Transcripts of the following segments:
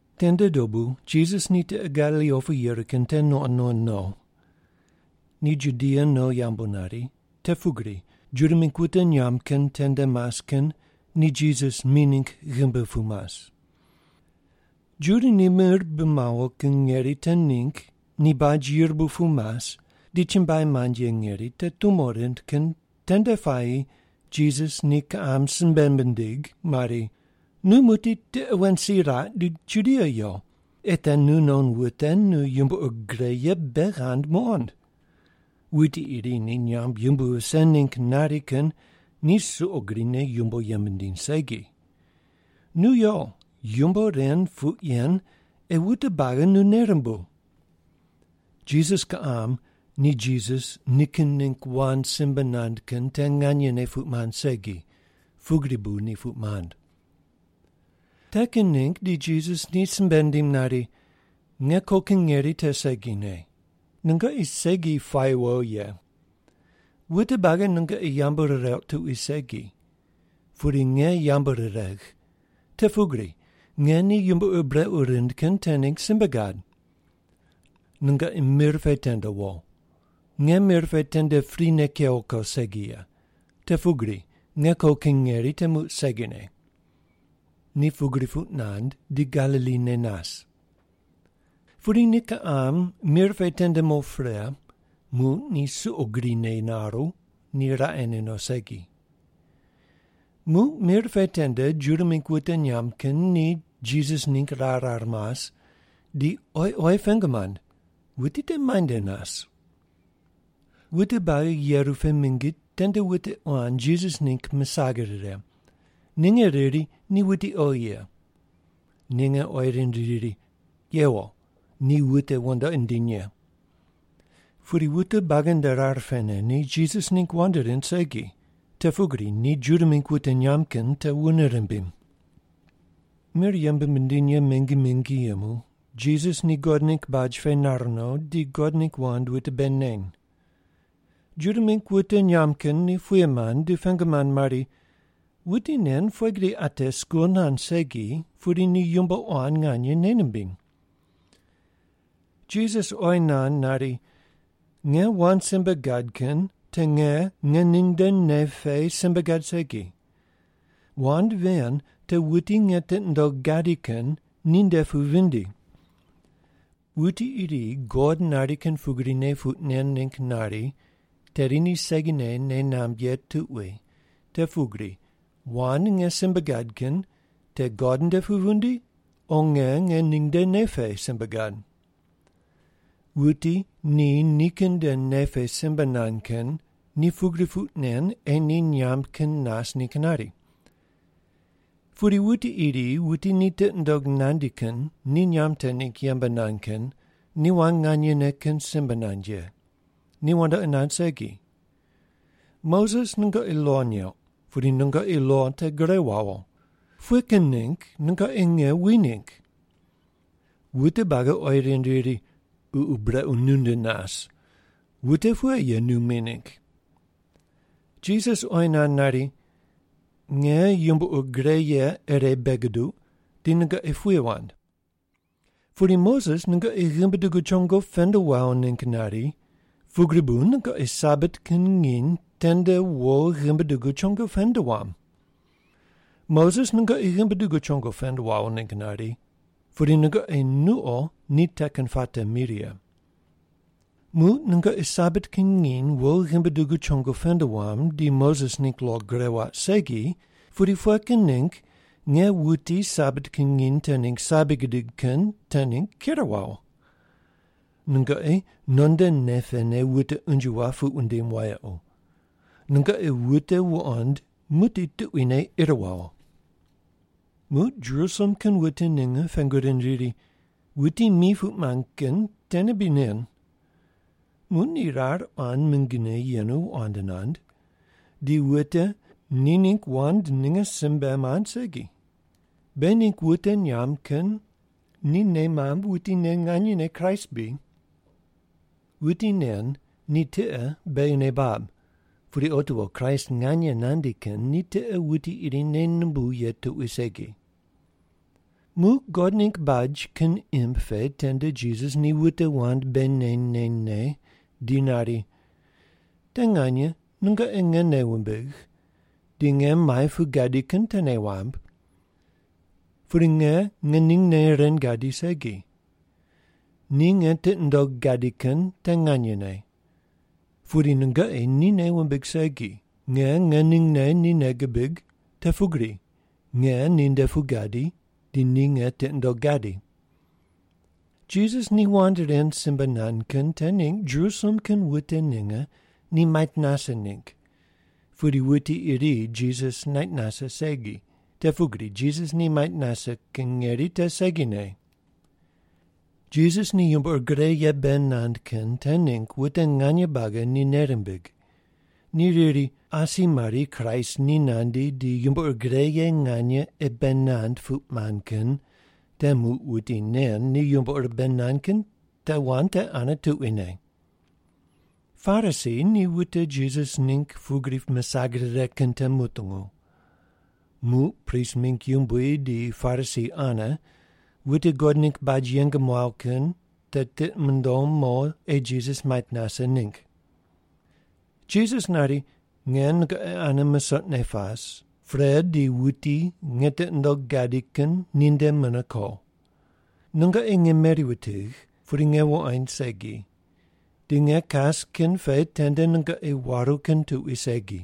Tende dobu Jisas ni tiqe Galili opu yeru kin te nuqond nuqond no. Ni Judia no yambu nari, te pugri Juda mingg wute nyamb kin tende mas kin ni Jisas mi ningg ghimbi pu mas. Juda ni mir bi mawo kin ngeri te ningg ni baj yirbu pu mas di chumbuai mand ye ngeri te tumo rind kin tende puayi Jisas ni kiqam simbe mindig mari, “Nu muqdi tiqe wen si raq di Judia yo, ei te nu non wute nu yumbo ur gre ye bei ghand muqond. Wuti iri ni nyamb yumbui vise ningg nari kin ni suqo grine yumbo yembe nindiny segi. Nu yo yumbo ren puq yen ei wute buagi nu nei rumbuw.” Jisas kiqam ni Jisas nikin ningg wand simbe nand kin te nganyene puq mand segi, pugri bu ni puq mand. Te kin ningg di Jisas ni simbe nindim nari, “Nge ko kin ngeri te segine. Nungoqi segi puayi wo ye. Wute buagi nungoqi yambu rireuq tuqui segi, pudi nge yambu riregh, te pugri nge ni yumbo ur brequ rind kin te ningg simbe gad. Nungoqi mir pe tende wo. Nge mir pe tende prine kewo ko segi ye, te pugri nge ko kin ngeri te muq segine.” Ni pugri puq nand di Galili ne nas. Pudi ni kiqam mir pe tende mo pre, muq ni suqo grine naru, ni raqene no segi. Muq mir pe tende Juda mingg wute nyamb kin ni Jisas ningg rar rar mas, di oyi oyi pengu mand, “Wuti te muainde nas?” Wute buagi yeru pe mingi tende wute quan Jisas ningg misag rire. Ninge riri, “Ni wuti oghi ye.” Ninge oyi rind riri, “Yewo, ni wute wandoqi nindiny ye.” Pudi wute buagi nde rar pene ni Jisas ningg wand rind segi, te pugri ni Juda mingg wute nyamb kin te wune rimbim. Mir yembe mindiny ye te mingi mingi yemu, Jisas ni God ningg baj pe nar no di God ningg wand wute bei neny. Juda mingg wute nyamb kin ni puye mand di pengu mand mari, “Wuti nen pughe gri ate skul nand segi pudi ni yumbo quan nganye nei nimbiny?” Jisas oyi nand nari, “Nge wand simbe gad kin te nge ngening nde nei pe simbe gad segi. Wand ven te wuti nge tiqi nundogh gadi kin ni nde pu vindi. Wuti iri God nari kin pugrine puq nen ningg nari, tedi ni segine nei namb ye tuqui te pugri wand nge simbe gad kin te God nde pu vindi, o nge ngening nde nei pe simbe gad. Wuti ni nikin nde nei pe simbe nand kin ni pugri puq nen ei ni nyamb kin nas ningg nari. Pudi wuti iri wuti ni tiqi nundog nandi kin ni nyamb te ningg yembe nand kin ni wand nganyene kin simbe nand ye. Ni wandoqi nand segi. Moses nungoqi lo neuq, pudi nungoqi lo te gure wawo. Pughe kin ningg nungoqi nge wi ningg?” Wute buagi oyi rind riri, “Ququ brequ nu nde nas. Wute pughe ye nu mi ningg?” Jisas oyi nand nari, “Nge yumbo ur gre ye ire bei guduq di nungoqi puye wand. Pudi Moses nungoqi ghimbi dugu chongo pend wawo ningg nari, pugri bu nungoqi Sabat kin nginy tende wo ghimbi dugu chongo pend wam. (Moses nungoqi ghimbi dugu chongo pend wawo ningg nari, pudi nungoqi nuqo ni te kin puate mi righe.) Muq nungoqi Sabat kin nginy wo ghimbi dugu chongo pend wam, di Moses ningg lo gure waq segi, pudi pughe kin ningg nge wuti Sabat kin nginy te ningg sabi gidig kin te ningg ker wawo? Nungoqi non nde nei pene wute unje map puq wundim wayequ. Nungoqi wute wuqond muqdi tuquine ir wawo.” Muq Jerusalem kin wute ninge pengu rind riri, “Wuti mi puq mand kin tene bri nen? Muq ni rar quan mingine yenu wand nand, di wute ni ningg wand ninge simbe mand segi. Beghi ningg wute nyamb kin ni nei mamb wuti nen nganyene Kraist bri? Wuti nen ni tiqe beghi nei bab, pudi otiwo Kraist nganye nandi kin ni tiqe wuti iri nei numbuw ye tuqui segi.” Muq God ningg baj kin imb pe tende Jisas ni wute wand bei neny nenyne di nari, “Te nganye nungoqi nge nei wumbigh, di nge muai pu gadi kin te nei wamb. Pudi nge ngeningne ren gadi segi. Ni nge tiqi nundogh gadi kin te nganyene. Pudi nungoqi ni nei wumbig segi, nge ngeningne ni nei gibig, te pugri nge ni nde pu gadi, di ni nge tiqi nundogh gadi.” Jisas ni wand ren simbe nand kin te ningg Jerusalem kin wute ninge ni mait nase ningg, pudi wuti iri Jisas nait nase segi, te pugri Jisas ni mait nase kin ngeri te segine. Jisas ni yumbo ur gre ye bei nand kin te ningg wute nganye buagi ni nei rimbig. Ni riri, “Asi mari Kraist ni nandi di yumbo ur gre ye nganye ei bei nand puq mand kin te muq wuti nen ni yumbo ur bei nand kin te wand te ane tuquine.” Parisi ni wute Jisas ningg pugri misag rire kin te mutungu. Muq prist mingg yumbui di Parisi ane wute God ningg baj yeng muaw kin te tiqi mundom mo ei Jisas mait nase ningg. Jisas nari, “Nge nungoqi ane musoqne pas, pre di wuti nge tiqi nundogh gadi kin ni nde mune ko. Nungoqi nge meri wutigh, pudi nge wuqoind segi, di nge kas kin pe tende nungoqi waru kin tuqui segi.”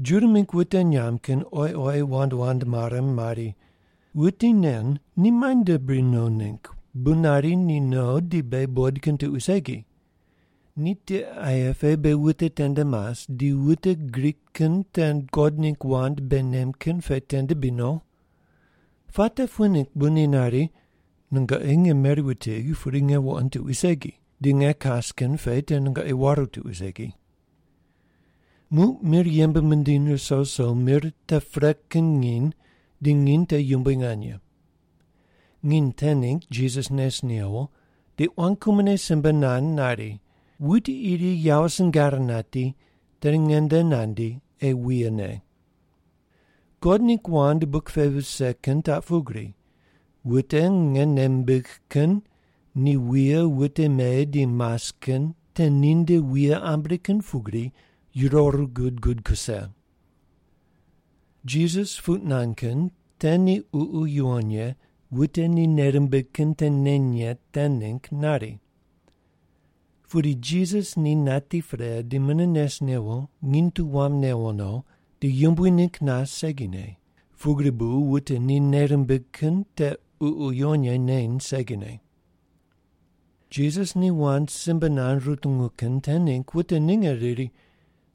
Juda mingg wute nyamb kin oyi oyi wand wand mare mari, “Wuti nen ni muainde bri no ningg bu nari ni no di beghi buqoid kin tuqui segi? Ni tiqe aye pe beghi wute tende mas, di wute Grik kin te God ningg wand bei nem kin pe tende bri no? Puate pughe ningg bu ni nari, ‘Nungoqi nge meri wutigh pudi nge wuqoind tuqui segi,’ di ‘Nge kas kin pe te nungoqi waru tuqui segi’?” Muq mir yembe mindiny ruso ruso mir te pre kin nginy di nginy te yumbui nganye. Nginy te ningg Jisas nes newo, di quan kumone simbe nand nari, “Wuti iri yawo singar nati tedi nge nde nandi, ei wuye ne. God ningg wand buk pe vise kin taq pugri, wute nge nei mimbigh kin ni wuye wute me di mas kin te ni nde wuye ambri kin pugri yuroru gud gud kuse.” Jisas puq nand kin te ni Ququ Yuwon Ye wute ni nei rimbig kin te neny ye te ningg nari. Pudi Jisas ni nati pre di mune nes newo nginy tu wam newo no di yumbui ningg nas segine, pugri bu wute ni nei rimbig kin te Ququ Yuwon Ye neny segine. Jisas ni wand simbe nand rutungu kin te ningg wute ninge riri,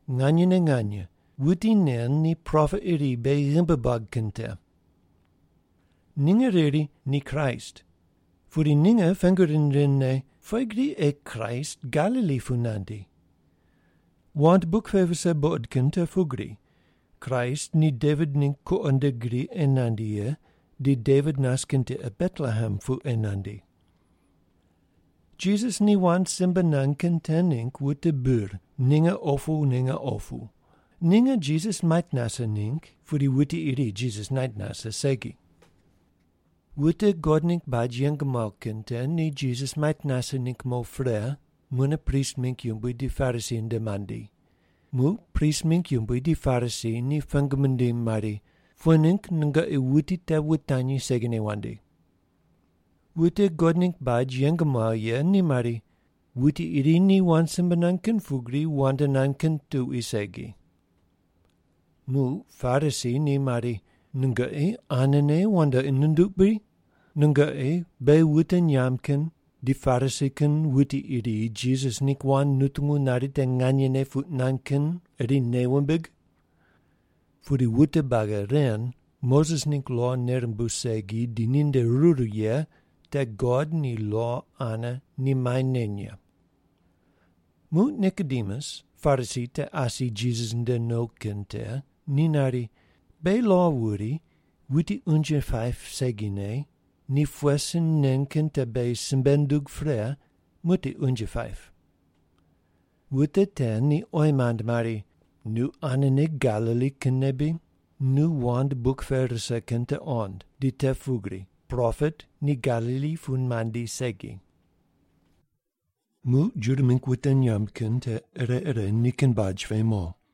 “Nganyene nganye, wuti nen ni propet iri beghi ghimbi buag kin te.” Ninge riri, “Ni Kraist.” Pudi ninge pengu rind rindne, “Pughe gri ei Kraist Galili pu nandi? Wand buk pe vise buqod kin te pugri, Kraist ni Devit ningg kuqo nde gri ei nandi ye, di Devit nas kin tiqe Betlehem pu ei nandi.” Jisas ni wand simbe nand kin te ningg wute bir, ninge opu ninge opu. Ninge Jisas mait nase ningg, pudi wuti iri Jisas nait nase segi. Wute God ningg baj yeng muaw kin te ni Jisas mait nase ningg mo pre, mune prist mingg yumbui di Parisi nde mandi. Muq prist mingg yumbui di Parisi ni pengu mindim mari, “Pughe ningg nungoqi wuti te wutanyi segine wandi?” Wute God ningg baj yeng muaw ye ni mari, “Wuti iri ni wand simbe nand kin pugri wand nand kin tuqui segi.” Muq Parisi ni mari, “Nungoqi anene wandoqi nunduq bri? Nungoqi beghi wute nyamb kin di Parisi kin wuti iri Jisas ningg wand nutungu nari te nganyene puq nand kin iri nei wumbig? Pudi wute buagi ren Moses ningg lo nei rumbuw segi di ninde ruru ye te God di lo ane ni mai neny ye.” Muq Nikodemus, Parisi te asi Jisas nde no kin te ni nari, “Beghi lo wuri, wuti unje paip segine ni pughe sin nen kin te beghi simbe nundug pre muqdi unje paip.” Wute te ni oyi mand mari, “Nu anene Galili kinne bri? Nu wand buk pe rise kin te qond, di te pugri propet ni Galili pu mandi segi.” Muq Juda mingg wute nyamb kin te ire ire nikin baj pe mo.